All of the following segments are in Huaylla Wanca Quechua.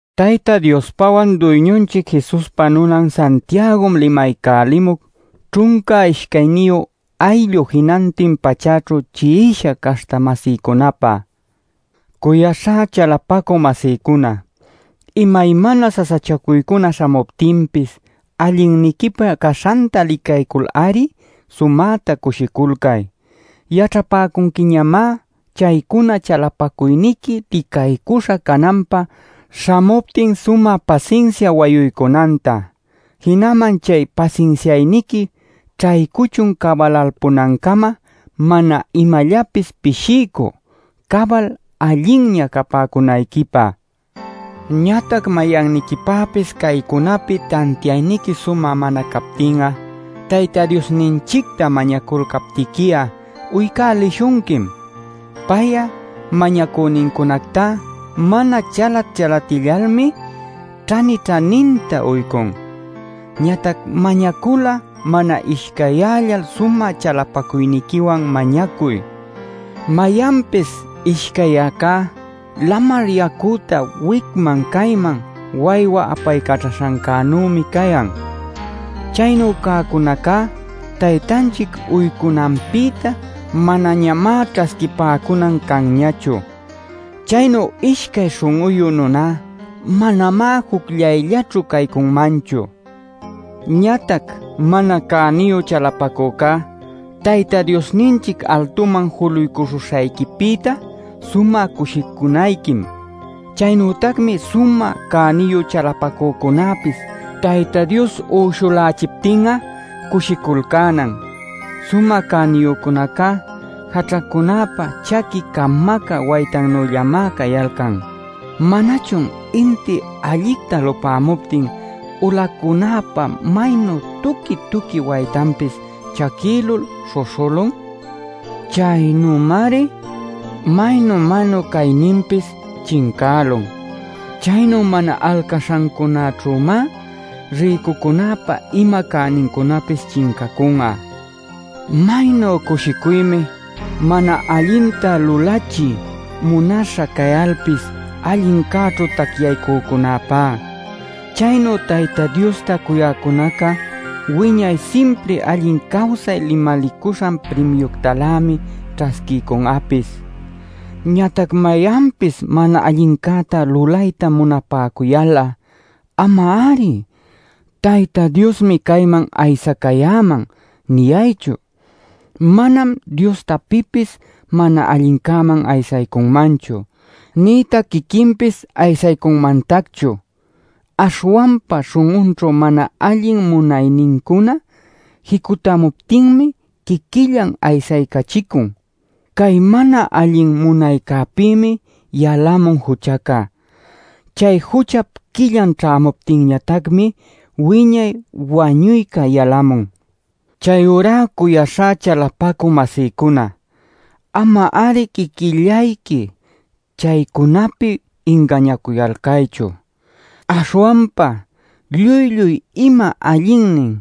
Tayta Diospawan Duyñunchic Jesuspa nunan Santiagom limaycälimuc ćhunca ishcayniyu ayllu jinantin pachäćhu chi'isha caśhta-masïcunapä. Cuyaśhá chalapacü-masïcuna, imaymana sasachacuycuna śhamuptinpis allinniquipä caśhanta licaycul-ari sumäta cushiculcay. Yaćhapäcunquiñamá chaycuna chalapacuyniqui licaycuśha cananpä śhamuptin sumä pasinsia wayuycunanta. Jinaman chay pasinsiayniqui ćhaycuchun cabalalpunancama mana imallapis pishiycü, cabal allinña capäcunayquipä. Ñatac mayanniquipäpis caycunapi tantiayniqui sumä mana captin'a Tayta Diosninchicta mañaculcaptiqui'a uycälishunquim. Pay'a mañacünincunactá mana chalat-chalatyallalmi ćhani-ćhaninta uycun. Ñatac mañacul'a mana ishcayyällal sumä chalapacuyniquiwan mañacuy. Mayanpis ishcayyäcá lamar yacüta wicman cayman waywa apaycaćhaśhancänümi cayan. Chaynu cäcunacá Taytanchic uycunanpïta manañamá ćhasquipäcunan canñachu. Chaynu ishcay śhun'uyu nuná manamá jucllayllaćhu caycunmanchu. Ñatac mana cäniyu chalapacücá Tayta Diosninchic altuman juluycuśhuśhayquipïta sumä cushicunayquim. Chaynütacmi sumä cäniyu chalapacücunäpis Tayta Dios uyshulächiptin'a cushiculcänan. Sumä cäniyücunacá jaćhacunäpa chaqui camacä waytannüllamá cayalcan. ¿Manachun inti allicta lupämuptin ulacunäpa maynu tuqui-tuqui waytanpis chaquïlul śhuśhülun? Chaynümari maynu-maynu cayninpis chincälun. Chaynu mana alcaśhancäćhümá rïcucunäpa ima cänincunapis chincacun'a. Maynu cushicuymi mana allinta lulachiy munaśha cayalpis allincäćhu tacyaycücäpá; chaynu Tayta Diosta cuyäcunaca wiñay simpri allin cawsay limalicuśhan primiuctalämi ćhasquiycun'apis. Ñatac mayanpis mana allincäta lulayta munapäcuyal'a ama-ari “Tayta Diosmi cayman aysacayäman” niyaychu. Manam Diostá pipis mana allincäman aysaycunmanchu, nïtac quiquinpis aysaycunmantacchu. Aśhwanpa śhun'unćhu mana allin munaynincuna jicutämuptinmi quiquillan aysaycachicun. Cay mana allin munaycäpïmi yalamun juchaca. Chay juchap quillan ćhämuptinñatacmi wiñay wañuyca yalamun. Chayurá cuyaśhá chalapacü-masïcuna, ama-ari quiquillayqui chaycunapi ingañacuyalcaychu. Aśhwanpa lluy-lluy ima allinnin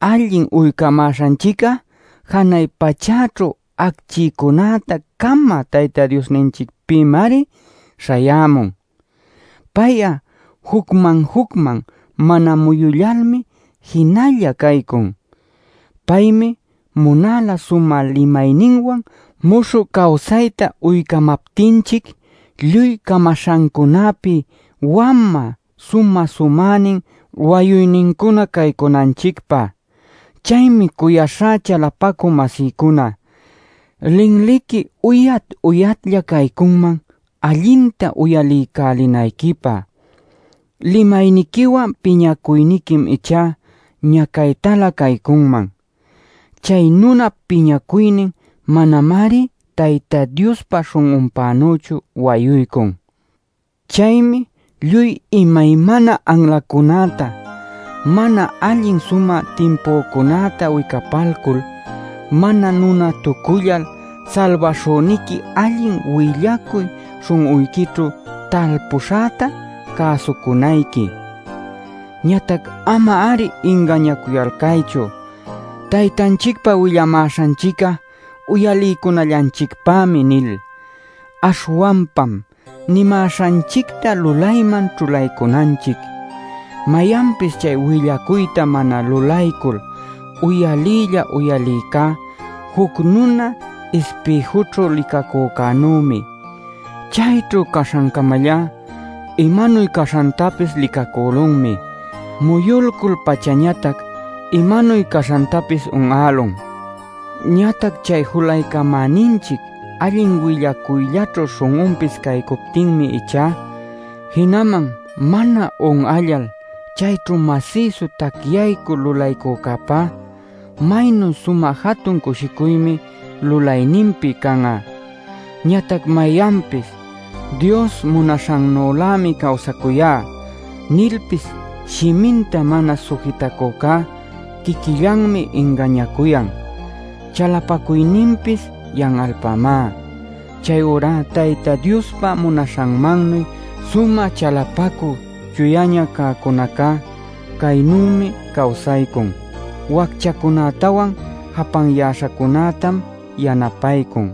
allin uycamäśhanchic'a janay pachäćhu acchicunäta camä Tayta Diosninchicpïmari śhayämun. Pay'a jucman-jucman mana muyullalmi jinalla caycun. Paymi munala sumä limayninwan muśhü cawsayta uycamaptinchic, lluy camaśhancunäpi wamä sumä-sumänin wayuynincuna caycunanchicpä. Chaymi cuyaśhá chalapacü-masïcuna, linliqui uyat-uyatlla caycunman allinta uyaliycälinayquipä. Limayniquiwan piñacuyniquim ichá ñacaytalä caycunman. Chay nunap piñacuynin manamari Tayta Diospa śhun'unpänüchu wayuycun. Chaymi lluy imaymana anlacunäta, mana allin sumä timpücunäta wicapaycul, mana nunatucullal salbaśhüniqui allin willacuy śhun'uyquićhu talpüśhäta cäsucunayqui. Ñatac ama-ari ingañacuyalcaychu “Taytanchicpa willamäśhanchic'a uyaliycunallanchicpämi” nil. Aśhwanpam nimäśhanchicta lulayman ćhulaycunanchic. Mayanpis chay willacuyta mana lulaycul uyaliylla uyalïcá juc nuna ispïjućhu licacücänümi. Chayćhu caśhancamallá imanuy caśhantapis licacülunmi; muyulcul-pachañatac imanuy caśhantapis un'älun. Ñatac chay julaycamäninchic allin willacuyllaćhu śhun'unpis caycuptinmi ichá, jinaman mana un'allal chayćhu masïsu tacyaycul lulaycücäpá, maynu sumä jatun cushicuymi lulayninpi can'a. Ñatac mayanpis “Dios munaśhannülämi cawsacuyá” nilpis shiminta mana sujitacücá quiquillanmi ingañacuyan; chalapacuyninpis yan'alpämá. Chayurá Tayta Diospa munaśhanmannuy sumä chalapacü chuyaña cäcunacá, caynümi cawsaycun: wacchacunätawan japanyäśhacunätam yanapaycun,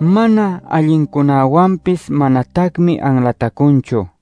mana allincunäwanpis manatacmi anlatacunchu.